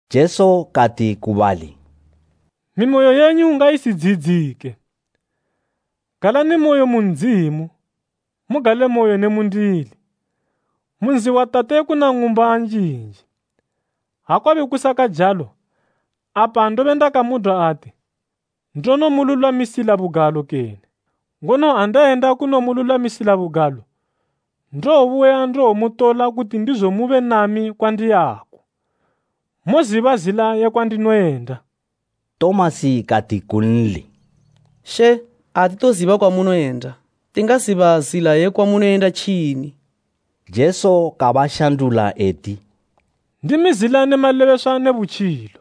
Jesu kati ku bali, “Mimoyo yenyu ngaisidziyidzike. Galanimoyo Galanimoyo: Kene “Mogalamoyo.” mu Ndzimu, mugalemoyo ne mundili. Mu nzi wa Tate kuna ng'umba njinji. Ha kwabe kusakajalo, apa ndobe ndakamudwa ati, ndonomululwamisila bugalo kene! Ngono ha ndayenda kunomululwamisila bugalo, ndowobuya ndiwomutola kuti ndizo mube nami kwandiyako. Moziba zila ye kwandinoyenda.” Tomasi kati kunli, “She, atitoziba kwamunoyenda. Tingaziba zila ye kwamunoyenda tjini?” Jesu kabashandula eti, “Ndimi zila ne malebeswa ne butjilo.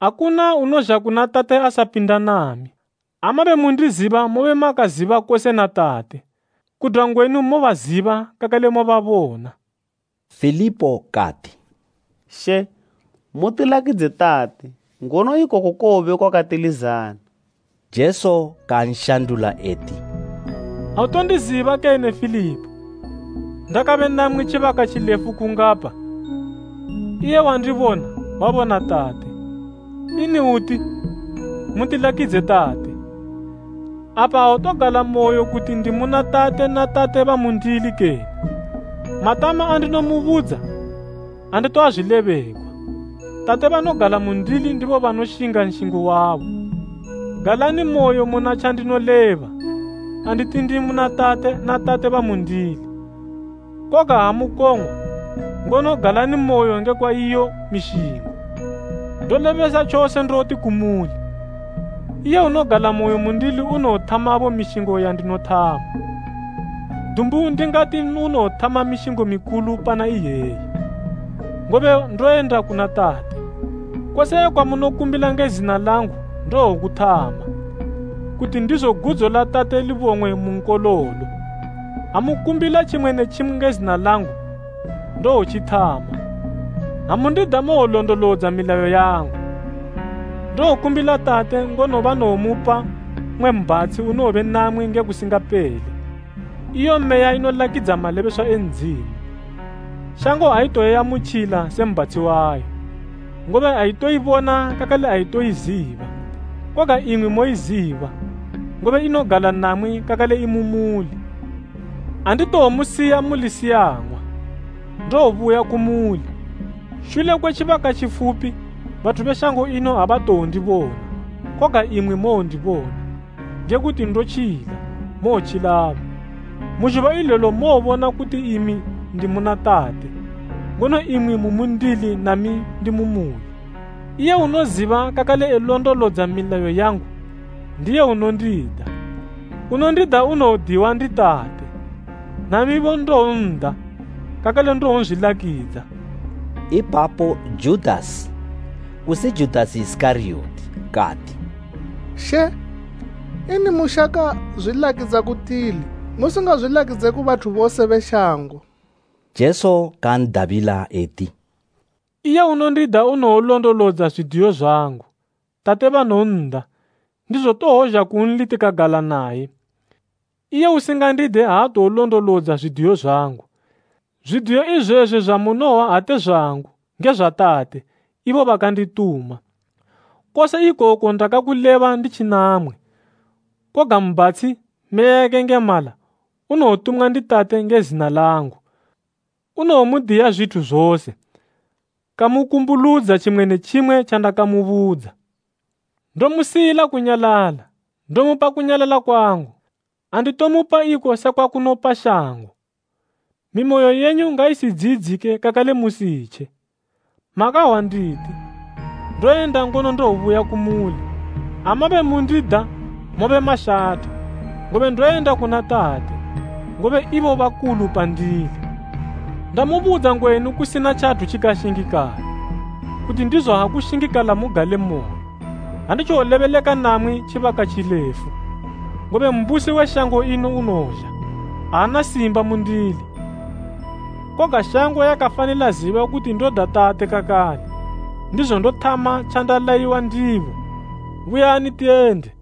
Akuna unozha kuna Tate asapinda nami. Ha mabe mundiziba mobe makaziba kose na Tate. Kudwa ngwenu mobaziba kakale mababona.” Filipo kati, “She, mutilakidze Tate ngono ikoko kowobe kwakatilizana.” Jesu kanshandula eti, “Autondiziba kene Filipo, ndakabe namwi tjibaka tjilefu kungapa? Iye wandibona wabona Tate. Ini uti, ‘Mutilakidze Tate?’ Apa autogalamoyo kuti ndi muna Tate na Tate bamundili kene? Matama andinomubudza anditoazwilebegwa. Tate banogala mundili ndibo banoshinga nshingo wabo. Galanimoyo muna tjandinoleba anditi ndi muna Tate na Tate bamundili; koga ha mukong'wa, ngono galanimoyo ngekwa iyo mishingo. Ndolebesa tjose ndoti kumuli, iye unogalamoyo mundili unowothamabo mishingo yandinothama, dumbu ndingati unowothama mishingo mikulu pana iyeyi, ngobe ndoyenda kuna Tate. Kose kwamunokumbila nge zina langu ndowokuthama, kuti ndizo gudzo la Tate libong'we mu Nkololo. Ha mukumbila tjimwe ne tjimwe nge zina langu, ndowotjithama. “Ha mundida mowolondolodza milayo yangu. Ndowokumbila tate, ngono banowomupa mmwe Mbhatshi unowobe namwi nge kusingapele, iyo Meya inolakidza malebeswa e Ndzimu. Shango aitowoiamutjila se mbhatshi wayo, ngobe aitoibona kakale aitowoiziba. Koga imwi moiziba, ngobe inogala namwi kakale imumuli. “Anditowomusiya muli siyang'wa; ndowobuya kumuli. Shule kwe tjibaka tjifupi, bathu be shango ino abatjowondibona, koga imwi mowondibona. Nge kuti ndotjila, mowotjilabo. Mu zhuba ilelo mowobona kuti imi ndi muna Tate, ngono imwi mu mundili nami ndi mu muli. “Iye unoziba kakale elondolodza milayo yangu, ndiye unondida. Unondida unowodiwa ndi Tate, namibo ndowon'da kakale ndowonzwilakidza.” Ipapo Judasi, kusi Judasi Isikariyoti kati, “She, ini mushaka zwilakidza ku tili musingazwilakidze ku bathu bose be shango?” Jesu kan'dabila eti, “Iye unondida unowolondolodza zwidiyo zwangu. Tate banowon'da, ndizo towozha kunli tikagala naye. Iye usingandide aatowolondolodza zwidiyo zwangu. Zwidiyo izwezwi zwamunohwa ate zwangu, nge zwa Tate, ibo bakandituma. “Kose ikoku ndakakuleba nditji namwi. Koga Mbhatshi, Meya yakayengemala, unowotumwa ndi Tate nge zina langu, unowomudiya zwithu zose, kamukumbuludza tjimwe ne tjimwe tjandakamubudza. “Ndomusiyila kunyalala, ndomupa kunyalala kwangu. Anditomupa iko sekwa kunopa shango. Mimoyo yenyu ngaisidziyidzike kakale musitje. Makahwa nditi, ‘Ndoyenda ngono ndowobuya kumuli.’ Ha mabe mundida mobe mashatha, ngobe ndoyenda kuna Tate. Ngobe ibo bakulu pandili. Ndamubudza ngwenu kusina tjathu tjikashingikala, kuti ndizo ha kushingikala mugalemoyo. Anditjowolebeleka namwi tjibaka tjilefu, ngobe mbusi we shango ino unozha. Aana simba mundili, koga shango yakafanila ziba kuti ndoda Tate kakale, ndizo ndothama tjandalayiwa ndibo. “Buyani tiyende.”